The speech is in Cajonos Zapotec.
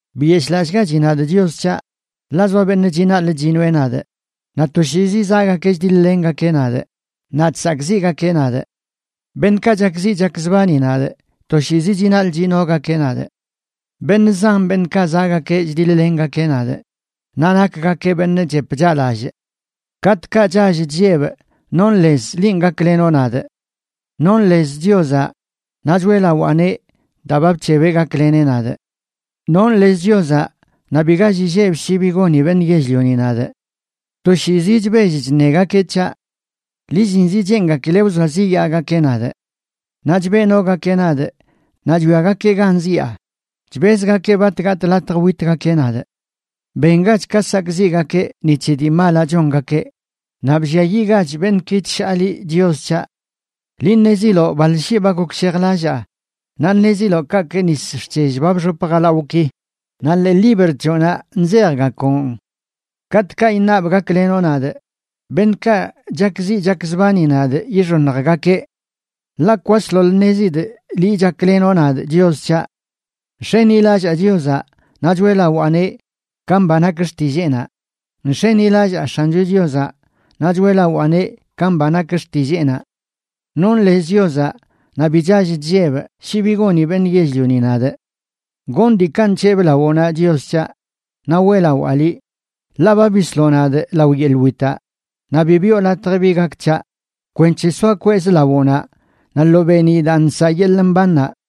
Biyeshꞌlallꞌgachi nadꞌ, Chios c̱haꞌ, ḻaꞌ zoa beṉꞌ chinaḻꞌ chinoeꞌ nadꞌ, naꞌ toshiizi zaꞌgakeꞌ chdiḻ-lengakeꞌ nadꞌ naꞌ chsakꞌziꞌgakeꞌ nadꞌ. Beṉꞌkaꞌ chakziꞌ chakzbani nadꞌ toshiizi chinaḻꞌ chinogakeꞌ nadꞌ; beṉꞌ zan beṉꞌkaꞌ zaꞌgakeꞌ chdiḻ-lengakeꞌ nadꞌ, naꞌ nakgakeꞌ beṉꞌ chep chaꞌlallꞌ. Katꞌkaꞌ chall chllebꞌ, nonꞌ lez linꞌ gaklenoꞌ nadꞌ. Nonꞌ lez Chiozaꞌ naꞌ choeꞌlawaaneꞌ daa ba bc̱hebeꞌ gakleneꞌ nadꞌ. Nonꞌ lez Chiozaꞌ naꞌ bi gall illebꞌ shi bi goni beṉꞌ yell-lioni nadꞌ. Toshiizi chbell chṉegakeꞌ c̱haꞌ; lillinzə cheengakileꞌ wzoaziꞌyaagakeꞌ nadꞌ. Naꞌ chbeꞌnogakeꞌ nadꞌ, naꞌ chwiagakeꞌ gan zyaa, chbezgakeꞌ bat gatꞌ latj witgakeꞌ nadꞌ. Bengach ka sakꞌziꞌgakeꞌ ni c̱he dii malaꞌ chongakeꞌ; naꞌ blliayiꞌgach beṉꞌki chshaa liꞌ, Chios c̱haꞌ. Liꞌ ṉeziloꞌ baḻ shii ba gokshejlallaa, naꞌ ṉeziloꞌ kaꞌkꞌ nis xc̱hell ba bxop jalawꞌki, naꞌ ḻee libr c̱hoꞌnaꞌ nzejgakoꞌn. Katꞌkaꞌ iṉabꞌ gaklenoꞌ nadꞌ, beṉꞌkaꞌ chakziꞌ chakzbani nadꞌ yixoṉjgakeꞌ. Ḻaꞌ kwasḻoḻ ṉezidꞌ liꞌ chaklenoꞌ nadꞌ, Chios c̱haꞌ. Nx̱enilallaa Chiozaꞌ, naꞌ choeꞌlawaaneꞌ ka mba nak xtilleenaꞌ, Nx̱enilallaa X̱ancho Chiozaꞌ, naꞌ choeꞌlawaaneꞌ ka mba nak xtilleenaꞌ. Nonꞌ lez Chiozaꞌ naꞌ bi chall chllebꞌ shi bi goni beṉꞌ yell-lioni nadꞌ. Gonꞌ diikaꞌ nc̱hebꞌ lawoꞌnaꞌ, Chios c̱haꞌ, naꞌ weꞌlawaa liꞌ, ḻaꞌ ba bisloꞌ nadꞌ lao yeḻꞌ witaꞌ, naꞌ bi biꞌo latj bi gak c̱haꞌ, kwenc̱he soa kwezꞌ lawoꞌnaꞌ naꞌ lo beeniꞌ daa nsaꞌ yeḻꞌ mbannaꞌ.